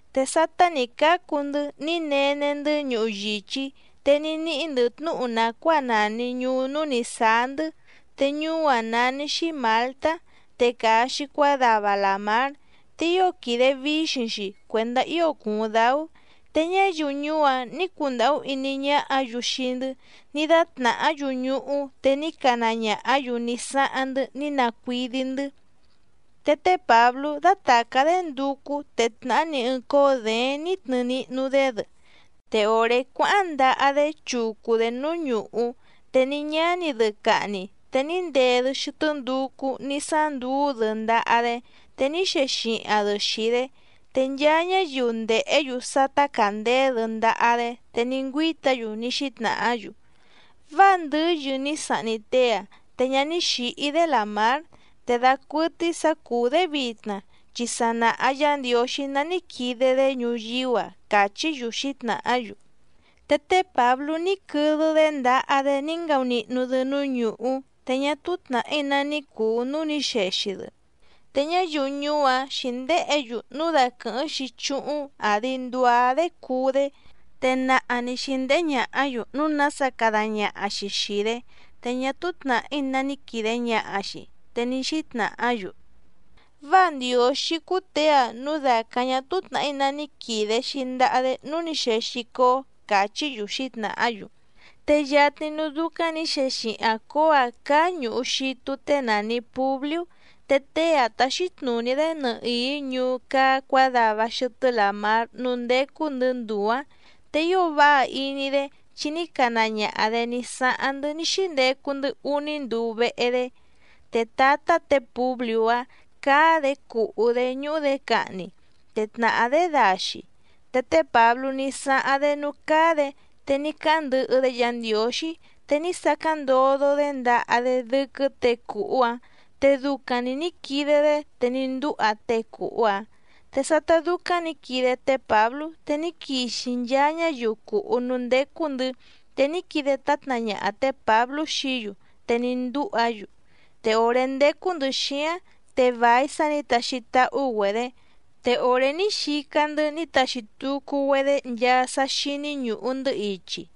Te sátá nǐ cácu‑ndɨ́ ní nene‑ndɨ́ ñuhu yìchí, te ní níhí‑ndɨ̌ tnúhu nàcuáa nàni ñuú núú nǐ sáá‑ndɨ́, te ñuú‑áⁿ nání‑xí Mǎltá, te càa‑xi cuádava làmár. Te ío quìde víxiⁿ‑xi cuèndá ío cùuⁿ dáú. Te ñáyiu ñuú‑áⁿ nǐ cundàhú iní ñáhǎ‑yu xii‑ndɨ́, ní dátnàhá‑yu ñuhú te ní cana ñàhá‑yu ní sáháⁿ‑ndɨ́ ní nacuídí‑ndɨ̌. Te té Pǎblú dátàcá‑dé nducú, te tnàhá‑ni ɨɨⁿ cóó děéⁿ nǐ tnɨɨ nihnu‑dé‑dɨ, te òré cuáháⁿ ndaha‑dé chucu‑dě núú ñùhú, te ní ñáni‑dɨ cahni, te ní ndee‑dɨ xɨtɨ́ nducú ní sánduú‑dɨ ndaha‑dé, te ní xexihaⁿ‑dɨ xìi‑dé. Te nchaa ñáyiu ndèhé‑yu sá tácàndeé‑dɨ ndaha‑dé, te ní ngüíta‑yu ní xítnàhá‑yu: —Váa ndɨ́yɨ ní sahni tée‑a, te ñá ní xǐhí‑dé làmár, te dacuɨtɨ́í sǎ cùú‑dé vitna, chi sa nàha Yá Ndiǒxí ná ní quide‑dé ñuyíú‑a —càchí‑yu xǐtnàhá‑yu. Te té Pǎblú ní quɨdɨ‑dé ndaha‑dé ní ngaunihnu‑dɨ núú ñùhú, te ñá túú tnàhí ná ní cùu núú nǐ xexi‑dɨ. Te ñáyiu ñuú‑áⁿ xǐndéhě‑yu núu daquɨ̀hɨ́ⁿ‑xi chúhúⁿ àdi nduá‑dé cuú‑dé. Te naha nǐ xíndéhé ñàhá‑yu núu nása cada ñaha‑xi xìi‑dé, te ñá túú tnàhí ná ní quìde ñaha‑xi, te ní xítnàhá‑yu: —Váa ndiǒxí cúú těe‑a núu dàcáⁿ ñá túú tnàhí ná ní quìde‑xi ndaha‑dé núú nǐ xexi cóó —càchí‑yu xǐtnàhá‑yu. Te yatni núú dúcáⁿ nǐ xexihaⁿ cǒó‑ǎⁿ cáá ñùhu xitu tée nàni Publiú, te tée‑áⁿ táxí tnùní‑dé nɨhìí ñuú cáá cuǎdava xɨtɨ́ làmár núú ndécú‑ndɨ̌ nduu‑ǎⁿ. Te ío váha iní‑dé chi ní cana ñaha‑dě ní sáháⁿ‑ndɨ́ ní xíndecu‑ndɨ́ úní nduu vehe‑dé. Te tǎtá tě Pùbliú‑áⁿ cáá‑dě cùhú‑dé ñúhú‑dě cahni, te tnàhá‑dé daxi. Te té Pǎblú ní sáháⁿ‑dé núú cáá‑dě, te ní cáháⁿ ndɨhɨ‑dé Yǎ Ndiǒxí, te ní sacáⁿ ndodo‑dé ndaha‑dé dɨ́quɨ́ těe cùhú‑áⁿ, te ducaⁿ‑ni nǐ quide‑dé, te ní ndúha tée cùhú‑áⁿ. Te sátá dúcáⁿ nǐ quide té Pǎblú, te ní quixi nchaa ñáyiu cùhú núú ndécú‑ndɨ̌, te ní quide tátna ñaha tě Pǎblú xií‑yu te ní ndúha‑yu. Te òré ndécú‑ndɨ̌ xíáⁿ, te vài sá nǐ taxi táhú‑güedě, te òré ní xica‑ndɨ́ ní taxi tucu‑güedé nchaa sá xíní ñùhu‑ndɨ́ ichi.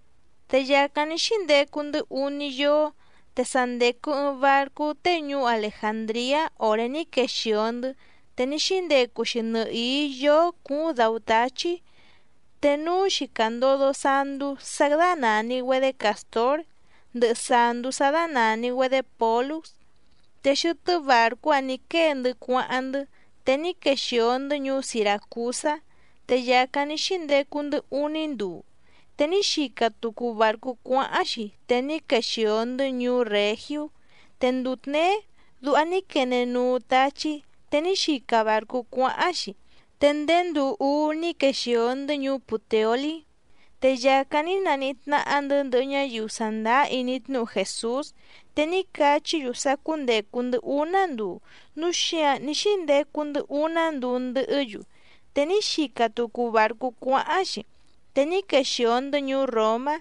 Te yàcáⁿ ní xíndecu‑ndɨ́ úní yóó, te sa ndècu ɨɨⁿ barcú tée ñuú Alejàndriá òré ní quexìo‑ndɨ́, te ní xíndecu‑xi nɨhìí yóó cúúⁿ dǎú táchí. Te núú‑xi càndodo sandú sá dánàni‑güedé Càstór ndɨhɨ sàndú sá dánàni‑güedé Pǒlúx, te xɨtɨ́ bàrcú‑áⁿ nǐ quée‑ndɨ́ cuáháⁿ‑ndɨ́. Te ní quexìo‑ndɨ́ ñuú Siràcusá, te yàcáⁿ ní xíndecu‑ndɨ́ úní nduu. Te ní xica tucu bàrcú cuáháⁿ‑xi, te ní quexìo‑ndɨ́ ñuú Règiú. Te nduu tněé duha ní quene nuu táchí. Te ní xica bàrcú cuáháⁿ‑xi, te ndéé nduu úú ní quexìo‑ndɨ́ ñuú Pùteolí. Te yàcáⁿ ní naníhí tnáhá‑ndɨ̌ ndɨhɨ ñáyiu sàndáá iní tnúhu Jèsús, te ní cachí‑yu sá cúndècu‑ndɨ́ úná nduu, núu xíǎⁿ ní xíndecu‑ndɨ́ úná nduu ndɨhɨ́‑yu. Te ní xica tucu bàrcú cuáháⁿ‑xi, te ní quexìo‑ndɨ́ ñuú Ròmá.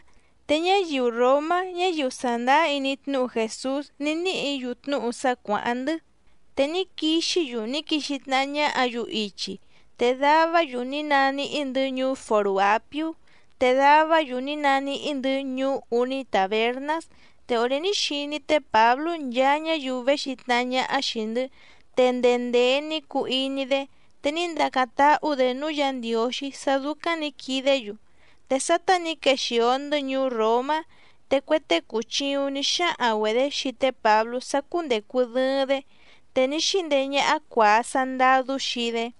Te ñáyiu ròmá ñáyiu sàndáá iní tnúhu Jèsús, ní níhǐ‑yu tnúhu sá cuàháⁿ‑ndɨ́, te ní quixí‑yu ní quixi tnahá ñáhǎ‑yu ichi. Te davá‑yu ní naníhí‑ndɨ̌ ñuú Fòrú Àpiú, te davá‑yu ní naníhí‑ndɨ̌ ñuú Úní Tàbernás. Te òré ní xiní té Pǎblú nchaa ñáyiu véxi tnahá ñáhá xìi‑ndɨ́, te ndee ndèe ní cuu iní‑dé, te ní ndacáⁿ táhú‑dě núú Yǎ Ndiǒxí sá dúcáⁿ nǐ quidé‑yu. Te sátá nǐ quexìo‑ndɨ́ ñuú Ròmá, te cue tée cùchiuⁿ ní xáhaⁿ‑güedě xii té Pǎblú sá cúndècu dɨɨⁿ‑dé, te ní xíndeé ñáhá cuàa sandadú xii‑dé.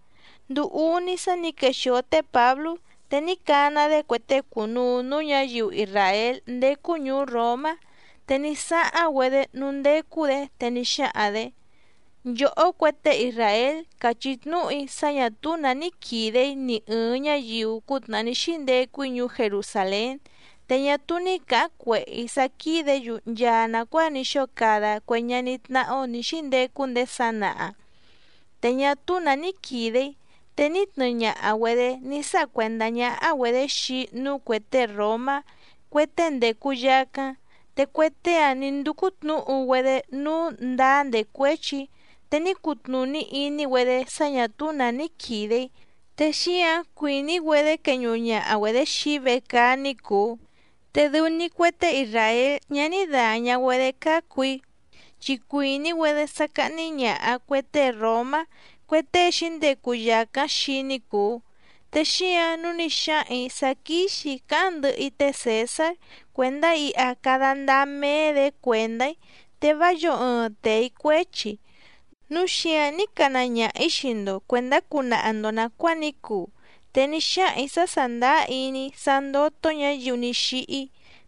Nduu úní sá nǐ quexìo té Pǎblú, te ní cana‑dé cue tée cùnuu núú ñǎyiu isràél ndécú ñùú Ròmá, te ní sáháⁿ‑güedé núú ndécú‑dě, te ní xáhaⁿ‑dě: —Nchòhó cue tée isràél, càchí tnúhu‑í sá ñà túú nǎ ní quìde‑í ni ɨ̀ɨⁿ ñáyiu cútnàhá ní xíndecu‑í ñuú Jerusàlén. Te ñá túú ní cǎháⁿ cuèhé‑í sá quídě‑yu nchaa nàcuáa ní xóo cada cue ñaní tnáhá‑ó nǐ xíndecu ndéé sanaha, te ñá túú nǎ ní quìde‑í te ní tnɨɨ ñaha‑güedě ní sáha cuèndá ñáhá‑güedě xii‑í núú cuè tée ròmá, cue tée ndècu yacáⁿ. Te cue tée‑áⁿ nǐ ndúcú tnǔhu‑güedé nǔu ndáá ndècuéchi‑í, te ní cutnùní iní‑güedé sá ñǎ túú nǎ ní quìde‑í, te xíǎⁿ cuìní‑güedé queñuhu ñaha‑güedě xii‑í vecaá ní cùu. Te dɨu‑ni cue tée isràél ñá ní dàña‑güedé cácu‑í, chi cuìní‑güedé sá cáhní ñàha cue tée ròmá, cue tée xǐndecu yàcáⁿ xii‑í ní cùu, te xíǎⁿ nǔu ní xáhaⁿ‑ǐ sá quíxì‑í cáháⁿ ndɨhɨ‑í té Cèsár cuèndá iha cada ndáá méé‑dě cuèndá‑í, te vá yǒo ɨɨⁿ tee‑í cuéchi. Núu xíǎⁿ ní cana ñaha‑ǐ xii‑ndo cuèndá cunaha‑ndo nàcuáa ní cuu. Te ní xáhaⁿ‑ǐ sá sàndáá iní‑í sá ndótó ñǎyiu ní xíhí,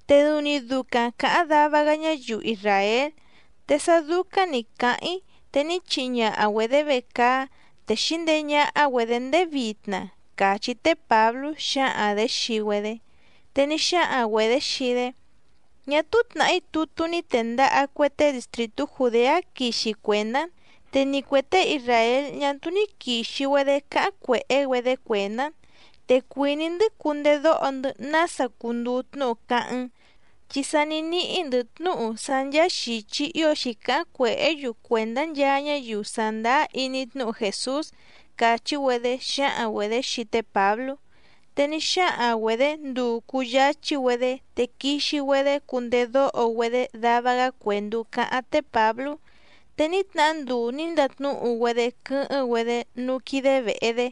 te dɨu‑ni ducaⁿ càháⁿ dava‑gá ñáyiu isràél, te sá dúcáⁿ nǐ cáháⁿ‑í, te ní chihi ñaha‑güedě vecaá, te xǐndeé ñáhá‑güedě ndéé vitna —càchí té Pǎblú xǎhaⁿ‑dě xii‑güedé. Te ní xáhaⁿ‑güedě xii‑dé: —Ñá túú tnàhí tutú ní tèndaha cue tée distrìtú Jùdeá quixi cuèndá‑n. Te ni cuè tée isràél ñá túú ní quìxi‑güedé cáháⁿ cuèhé‑güedé cuèndá‑n. Te cuìní‑ndɨ́ cundedóho‑ndɨ́ nása cunduu tnúhu cáháⁿ‑n, chi sa ní níhí‑ndɨ̌ tnúhu sá ncháá xìchi ío xǐcáháⁿ cuèhé‑yu cuèndá nchaa ñáyiu sàndáá iní tnúhu Jèsús —càchí‑güedé xǎhaⁿ‑güedě xii té Pǎblú. Te ní xáhaⁿ‑güedě nduu cùyáchí‑güedé te quixi‑güedé cundedóho‑güedé dava‑gá cuèndú cáháⁿ té Pǎblú. Te ní tnahá nduu nǐ ndatnúhu‑güedé quɨ́hɨ́ⁿ‑güedé núú quídé vèhe‑dé,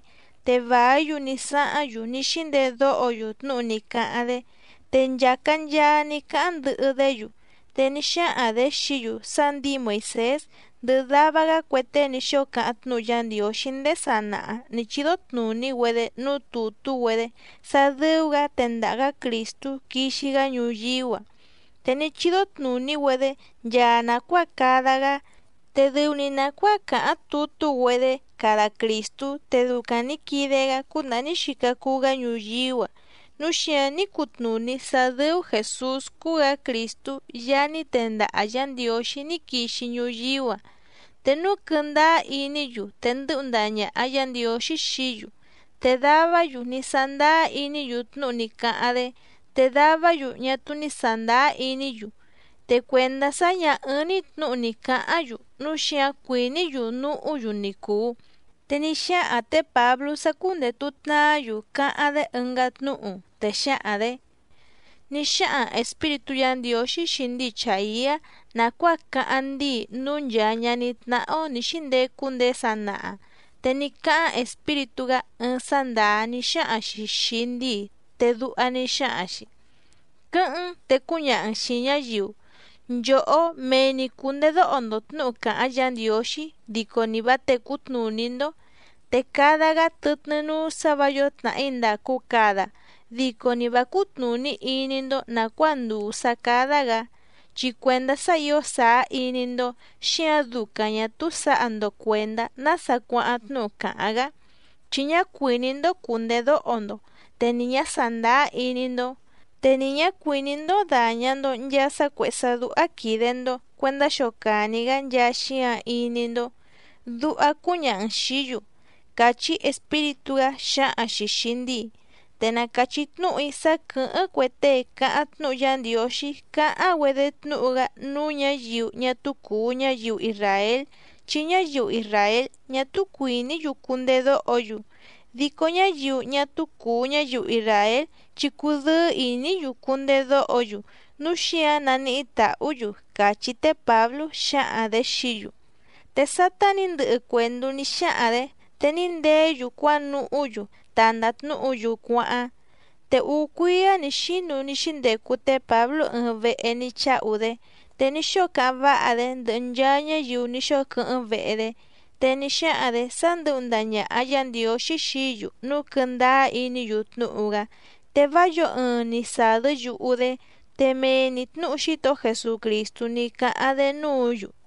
te vàí‑yu ní sáháⁿ‑yu ní xíndedóho‑yu tnúhu ní cáháⁿ‑dé, te nchàca nchaa ní cáháⁿ ndɨhɨ‑dé‑yu. Te ní xáhaⁿ‑dě xií‑yu sá ndǐi Moìsés ndɨhɨ dava‑gá cue tée ní xóo cáháⁿ tnúhu Yá Ndiǒxí ndéé sanaha nǐ chídó tnùní‑güedé núú tùtú‑güedé sá dɨ́ú‑gǎ tendaha‑gǎ Crìstú quixi‑gá ñuyíú‑a. Te ní chídó tnùní‑güedé nchaa nàcuáa cada‑gá, te dɨu‑ni nàcuáa càháⁿ tutú‑güedé cada Crìstú, te ducaⁿ nǐ quide‑gá cútnàhá ní xica cuu‑gá ñuyíú‑a, núu xíǎⁿ ní cutnùní sá dɨ́ú Jèsús cúú‑gǎ Crìstú Yaá ní tendaha Yǎ Ndiǒxí ní quixi ñuyíú‑a. Te núu quɨndáá iní‑yu, te ndɨ́hu ndaha ñàha Yá Ndiǒxí xií‑yu. Te davá‑yu ní sándáá iní‑yu tnúhu ní cáháⁿ‑dé, te davá‑yu ñá túú ní sàndáá iní‑yu. Te cuèndá sá ñǎ ɨ́ɨ́ⁿ‑ní tnǔhu ni cǎháⁿ‑yu, núu xíǎⁿ cuìní‑yu núhú‑yu ni cùu. Te ní xáhaⁿ tě Pǎblú sá cúndètu tnaá‑yu cáháⁿ‑dé ɨngá tnúhu, te xǎhaⁿ‑dě: —Ní xáhaⁿ Espíritú Yǎ Ndiǒxí xii ndíi Chàiá nàcuáa cáháⁿ ndíi núú nchàa ñaní tnáhá‑ó nǐ xíndecu ndéé sanaha. Te ní cáháⁿ Espíritú‑gá ɨɨⁿ sá ndàá ní xáhaⁿ‑xi xìi ndíi, te duha ní xáhaⁿ‑xi: Quɨ́hɨ́ⁿ‑n te cúñaha‑n xìi ñáyiu: Nchòhó mee‑ni cùndedóho‑ndo tnǔhu càháⁿ Yǎ Ndiǒxí, dico ni vǎ tècú tnùní‑ndó. Te cada‑gá tɨtnɨ́ núú sǎ vǎ yǒo tnàhí ndàcu cada, dico ni vǎ cútnùní iní‑ndó nàcuáa ndùu sá cádá‑gǎ, chi cuèndá sá ǐo sàá iní‑ndó, xíǎⁿ ducaⁿ ñà túú sǎha‑ndo cuèndá nása cuáháⁿ tnúhu càháⁿ‑gá, chi ñá cuìní‑ndó cùndedóho‑ndo, te ni ñǎ sàndáá iní‑ndó. Te ni ñǎ cuìní‑ndó dàña‑ndo nchaa sá cuèhé sá dúhá quìde‑ndo cuendá xocàni‑gá nchaa xíǎⁿ iní‑ndó, duha cúñaha‑n xìí‑yu. Càchí Espíritú‑gá xǎhaⁿ‑xi xìi ndíi. Te na càchí tnúhu‑í sá quɨ̀hɨ́ⁿ cue tée càháⁿ tnúhu Yá Ndiǒxí cáháⁿ‑güedé tnúhu‑gá núú ñǎyiu ñá túú cùu ñáyiu isràél, chi ñáyiu isràél ñá túú cuìní‑yu cundedóho‑yu. Dico ñáyiu ñá túú cùu ñáyiu isràél chi cùdɨ́ɨ́ ìní‑yu cundedóho‑yu, núu xíǎⁿ naníhí tàhú‑yu —càchí té Pǎblú xǎhaⁿ‑dě xií‑yu. Te sátá nǐ ndɨhɨ cuèndú ní xáhaⁿ‑dě, te ní ndeé‑yu cuánuhú‑yu ta ndàtnúhu‑yu cuáháⁿ. Te úú cuíá nǐ xínu ní xíndecu té Pǎblú ɨɨⁿ vehe ní cháhu‑dé. Te ní xóo cáháⁿ váha‑dé ndɨhɨ nchaa ñáyiu ní xóo quɨ́hɨ́ⁿ vehe‑dé. Te ní xáhaⁿ‑dě sá ndɨ̌hu ndaha ñàha Yá Ndiǒxí xií‑yu núu quɨndáá iní‑yu tnúhu‑gá, te vá yǒo ɨɨⁿ ni sàdɨ́ yuhu‑dé. Te mee‑ni tnǔhu Xítohó Jesucrìstú ní cáháⁿ‑dé núǔ‑yu.